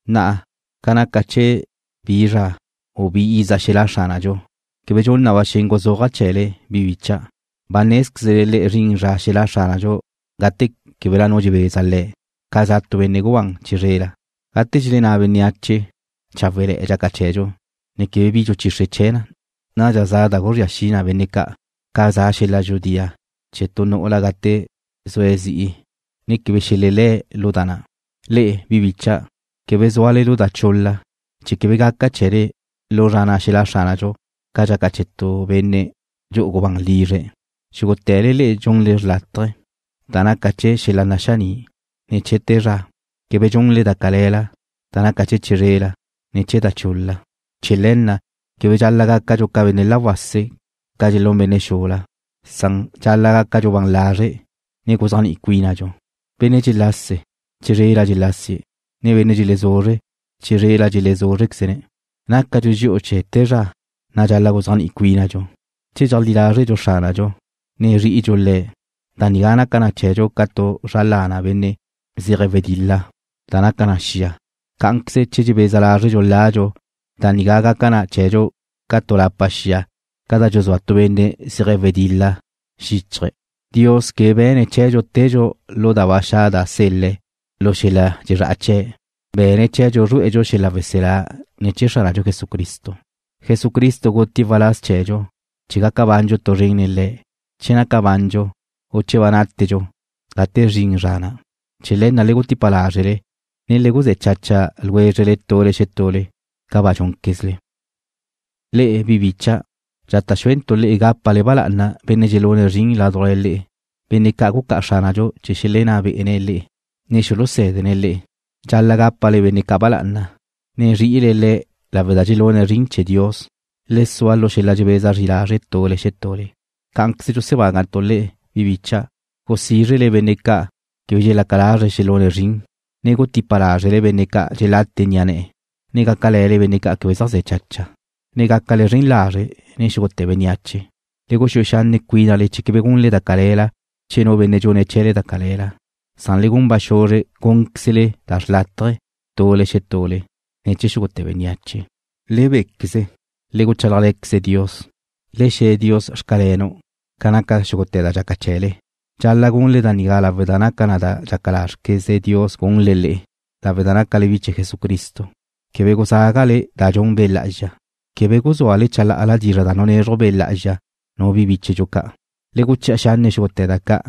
Na'a, ca naca chee̱ bi zra, u bi iza xelá' Xránadxu, quebe dxun na ba xen guzúaja' chee̱le, bi bicha'. Ba nézquezle le'e zrin zra xelá' Xránadxu gate québela nu dxebeza Le̱', ca za tu benne' gubán chizrela. Gate dxelenná bénneache: Cháwele̱'e̱ dxaca chee̱dxu, ne quebe bi dxuchixre chee̱, nadxa za da guzría xi na benne' ca', ca za xel-la dxudía chee̱ tu nu'ula gate zue̱' zi'i, ne quebe xelelé̱' lu da na'. Le'e, bi bicha', quebe zúale lu da chul-la, chee̱ quebe gaca chee̱le lu zra na' xelá' Xránadxu ca dxaca chee̱ tu benne' dxu'u gubán lizre̱'. Xúgute̱le le'e dxunle xrlátaje, da naca chee̱ xel-la naxaní', ne chee̱ te zra. Quebe dxundxu da cale̱la, da naca chee̱ chizrela, ne chee̱ da chul-la. Chee̱ le̱ na' quebe dxal-la' gácadxu ca benne' la wase' ca dxelún benne' xula, san dxal-la' gácadxu ban lazre', ne guzéajni'i cuínadxu. Benne' dxelase, chizrela dxelásie̱', ne benne' dxelezuzre, chizrela dxelezúzrequeze̱'. Nácadxu dxi'u chee̱ te zra, na' dxal-la' guzéajni'i cuínaquezdxu. Che dxeajlí lázredxu Xránadxu, ne zri'idxu Le̱', da nigá gaca na chee̱dxu ca tu zra lana benne' zeje̱' wedil-la da naca na xia. Cá'anqueze che dxebeza lázredxu ladxu, da nigá gaca na chee̱dxu ca tu lapa xia ca da dxuzúa tu benne' zeje̱' wedil-la xíchaje̱'. Dios quebe be̱ne̱' chee̱dxu tedxu lu da ba xa' da sel-le̱' lu xel-la dxezrá'a chee̱. Be̱ne̱' chee̱dxu zrué'edxu xel-la weselá ne̱ chee̱ Xránadxu Jesucristo. Jesucristo gutie̱' waláz chee̱dxu chee̱ gaca bandxu tu zren nen Le̱', che naca bandxu, u che ba nátedxu gate zrin zra na'. Chee̱ le̱ na' le gutipa lázrele, ne le guzé̱ chacha ljwézrele tule xetule, ca ba dxúnquezle. Le'e, bi bicha', dxata' xúentu' le'e gápale ba lá'ana benne' dxelune̱' zrin ládujla le'e, benne' ca' gucá'a Xránadxu chee̱ xelenná be'ene̱' le'e, ne xulusé̱dene̱' le'e. Dxal-la' gápale benne' ca' ba lá'ana, ne zri'ile le̱' lawe' da dxelune̱' zrin chee̱ Dios. Le sua lu xel-la dxebeza zri lazre' tule xetule. Cá'anqueze dxusebágantu' le'e, bi bicha', gusízrele benne' ca' quebe dxelaca lazre̱' xelune̱' zrin, ne gutipa lázrele benne' ca' dxelate ni'a ne̱'e̱, ne gácale̱le benne' quebe zaj ze̱' chacha, ne gácale zren lazre' nen xúgute̱ bénneache. Le guxúe xanne' cuínale chee̱ quebe gunle da cale̱la chee̱ nu benne' dxune̱' chee̱le da cale̱la, san le gun ba xuzre gúnquezle da xrlátaje, tule xetule, ne chee̱ xúgute̱ bénneache. Le béquezle. Le guchálajle̱quezle Dios. Le xe̱ Dios: Xcalenu' ca naca xúgute̱ da dxaca chee̱le. Dxal-la' gunle da nigá lawe' da naca na da dxaca lázrqueze Dios gunle le'e, lawe' da nácale bi chee̱ Jesucristo. Quebe guzágale da dxun Be' Lá'azxa. Quebe guzúale chalá'ala dizra' da nunezruj Be' Lá'azxa nu bi bíchedxu ca'. Le guchi'a xanne' xúgute̱ da ca',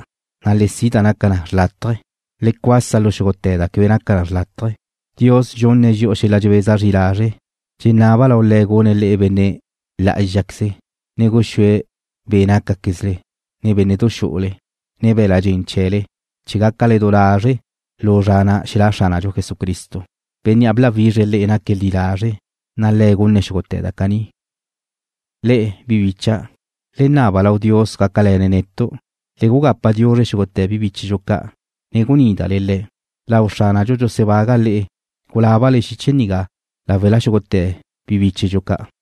na' le si' da naca na xrlátaje. Le cuasa lu xúgute̱ da quebe naca na xrlátaje. Dios dxunne̱' dxi'u xel-la dxebeza zri lazre'. Dxenaba' lau Le̱' gune̱' le'e benne' lá'azxaqueze, ne guxúe̱' be' nácaquezle, ne bénne'du xu'ule, ne be̱l-la' dxen chee̱le chee̱ gácale du lazre' lu zra na' xelá' Xránadxu Jesucristo. Bénnea' bláwizre̱' le'e naque̱' li lazre', na' Le̱' gune̱' xúgute̱ da caní. Le'e, bi bicha', le naba lau Dios gácal-lene' netu'. Le gugapa diuzre xúgute̱ bi bíchedxu ca', ne gunídale le̱'. Lau Xránadxu dxusebaga' le'e gulábale xiche nigá láwela xúgute̱ bi bíchedxu ca'.